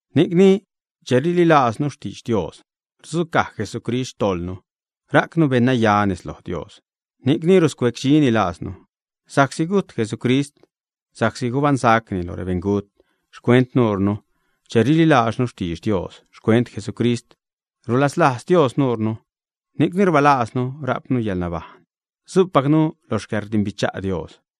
Ni'cni che rililajznu xtidx Dios rudzucaj Jesucrist xtojḻnu rajcnu beṉnaya nez loj Dios, ni'cni ruscuecdxini lajznu. Sa'csi gujt Jesucrist, sa'csi gubaṉsacni lo rebeṉgut xcuent nuurnu, che rililajznu xtidx Dios xcuent Jesucrist, rulaslajz Dios nuurnu, ni'cni rbalajznu, rajpnu yäḻnabajṉ, su'pacnu lo xcäḻrdimbicha' Dios.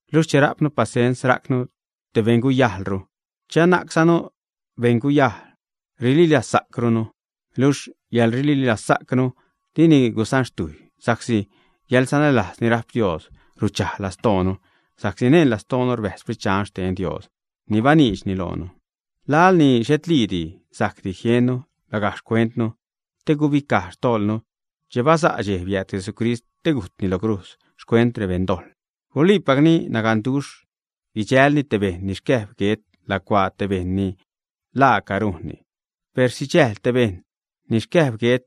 Luxh che rajpnu pasens rajcnu te beṉguyajlru; che anajczanu beṉguyajl, rililazsa'crunu. Luxh yäḻrililazsa'cnu dini gusanxtujy, sa'csi yäḻsanälajz ni rajp Dios ruchaj lastoonu sa'csi neṉ lastoonu rbäjz Xsprit Dxan xten Dios ni baniidxni loonu. Laḻ ni xhetliidi sajcdi jiennu lagajc xcuentnu te guibicaj xtojḻnu, che basa' dxej biääd Jesucrist te gujtni lo crujz xcuent rebeṉdojḻ. Guliipacni, naganduxh guidxälni te bejṉ ni xcäjb guet lacuaa te bejṉ ni laaca rujnni. Per sidxäjl te bejṉ ni xcäjb guet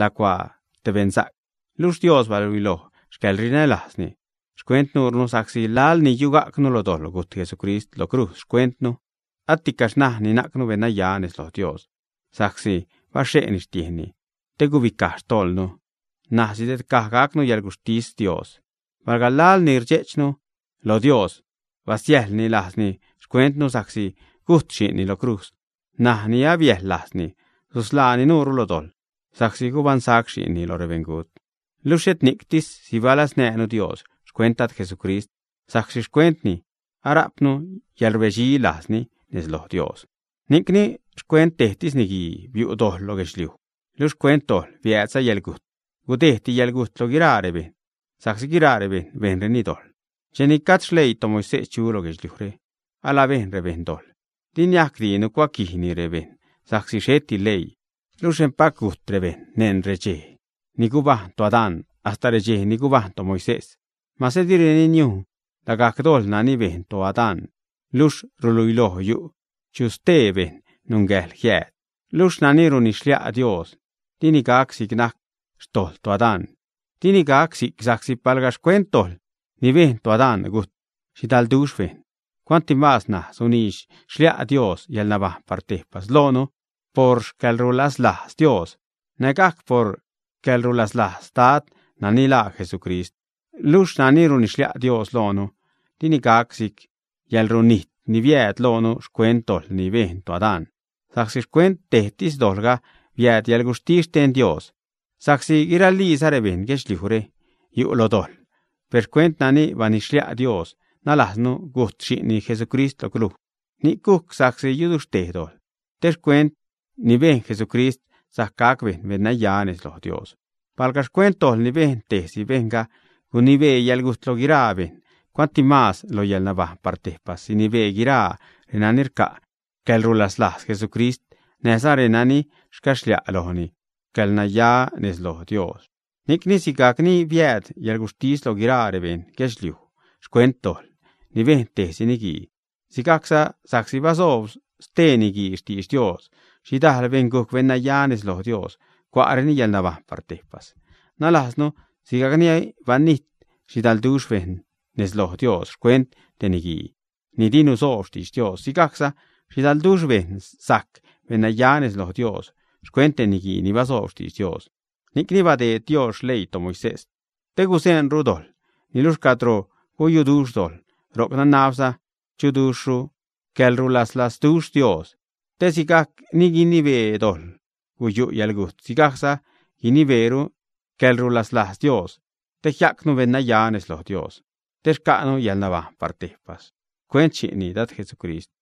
lacuaa te beṉsa'c. Luxh Dios baluiloj xcäḻrinälajzni xcuent nuurnu sa'csi laḻ ni yugajcnu lo dojḻ, gujt Jesucrist lo crujz xcuentnu. Aticaxh ṉaj ni najcnu beṉnaya nez loj Dios sa'csi baxhe'ni xtiejnni te gubicaj xtojḻnu, ṉaj sidedcaj gacnu xcäḻguxhtis Dios. Palga laḻ ni rdxe'chnu lo Dios, basiäjḻni lajzni xcuentnu sa'csi gujt Xi'nni lo crujz, ṉaj ni abiäjḻ lajzni, susḻaani nuure lo dojḻ sa'csi gubaṉsac Xi'nni loj rebeṉgut. Luxh xhet ni'ctis, sibalaznäjnu Dios xcuent Dad Jesucrist, sa'csi xcuentni ara'pnu yäḻrbedxi lajzni nez loj Dios. Ni'cni, xcuent tejtis niguii biu' dojḻ lo guedxliuj, luxh xcuent dojḻ biäädza yäḻgujt, gudejdti yäḻgujt loj guiraa rebejṉ, sa'csi guiraa rebejṉ bejnreni dojḻ. Cheni gajd xleii toMoisés chu lo guedxliujre, alabejn rebejṉ dojḻ, per di niajcdi nucuaquijni rebejṉ sa'csi xheti leii. Luxh empac gujt rebejṉ neṉ redxej ni gubajṉ toAdán hasta redxej ni gubajṉ toMoisés, mase direni niujn lagajc dojḻ nani bejn toAdán; luxh ruluiloj yu' chu stee bejṉ nungäjḻ jiääd. Luxh nani runidx-xlia' Dios dini gac si'c najc xtojḻ toAdán. Dini gac si'c sa'csi palga xcuent dojḻ ni bejn toAdán, gujt xhidalduxh bejṉ, cuantimaaz ṉaj sunidx-xlia' Dios yäḻnabajṉ par tejpas loonu por xcäḻrulaslajz Dios, nägajc por xcäḻrulaslajz Dad nani laa Jesucrist. Luxh nani runidx-xlia' Dios loonu dini gac si'c yäḻrunijt ni biääd loonu xcuent dojḻ ni bejn toAdán; sa'csi xcuent tejtis dojḻga biääd yäḻguxhtis xten Dios, sa'csi guiraliiza rebejṉ guedxliujre yu' lo dojḻ, per xcuent nani banidx-xlia' Dios, nalajznu, gujt Xi'nni Jesucrist lo crujz, ni'c gujc sa'csi yuduxhtej dojḻ, te xcuent ni bejn Jesucrist sajc gac bejṉ beṉnaya nez loj Dios. Palga xcuent dojḻ ni bejn tejsi bejṉga gunibee yäḻgujt lo guiraa bejṉ, cuantimaaz lo yäḻnabajṉ par tejpas sinibee guiraa reni rca' xcäḻrulaslajz Jesucrist näjza renani rcaxlia' lojni yäḻracnaya nez loj Dios. Ni'cni sigajc ni biääd yäḻguxhtis lo guiraa rebeṉ guedxliuj xcuent dojḻ ni bejn tejsi niguii, sigajcza sa'csi basoob stee niguii xtidx Dios, xhidal bejṉ gujc beṉnaya nez loj Dios, cua'reni yäḻnabajṉ par tejpas. Nalajznu sigajc ni banijt xhidalduxh bejṉ nez loj Dios xcuent tej niguii ni di nusoob xtidx Dios, sigajcza xhidalduxh bejṉ sajc beṉnaya nez loj Dios xcuent tej niguii ni basoob xtiidx Dios. Ni'cni badeed Dios xleii toMoisés, te guzeṉru dojḻ. Niluxh cadro guyuduxh dojḻ, ro'c nanabza chuduxhru xcäḻrulaslazduxh Dios, te sigajc ni gunibee dojḻ guyu' yäḻgujt, sigajcza guinibeeru xcäḻrulaslajz Dios te jia'cnu beṉnaya nez loj Dios, te xca'nu yäḻnabajṉ par tejpas xcuent Xi'nni, Dad Jesucrist.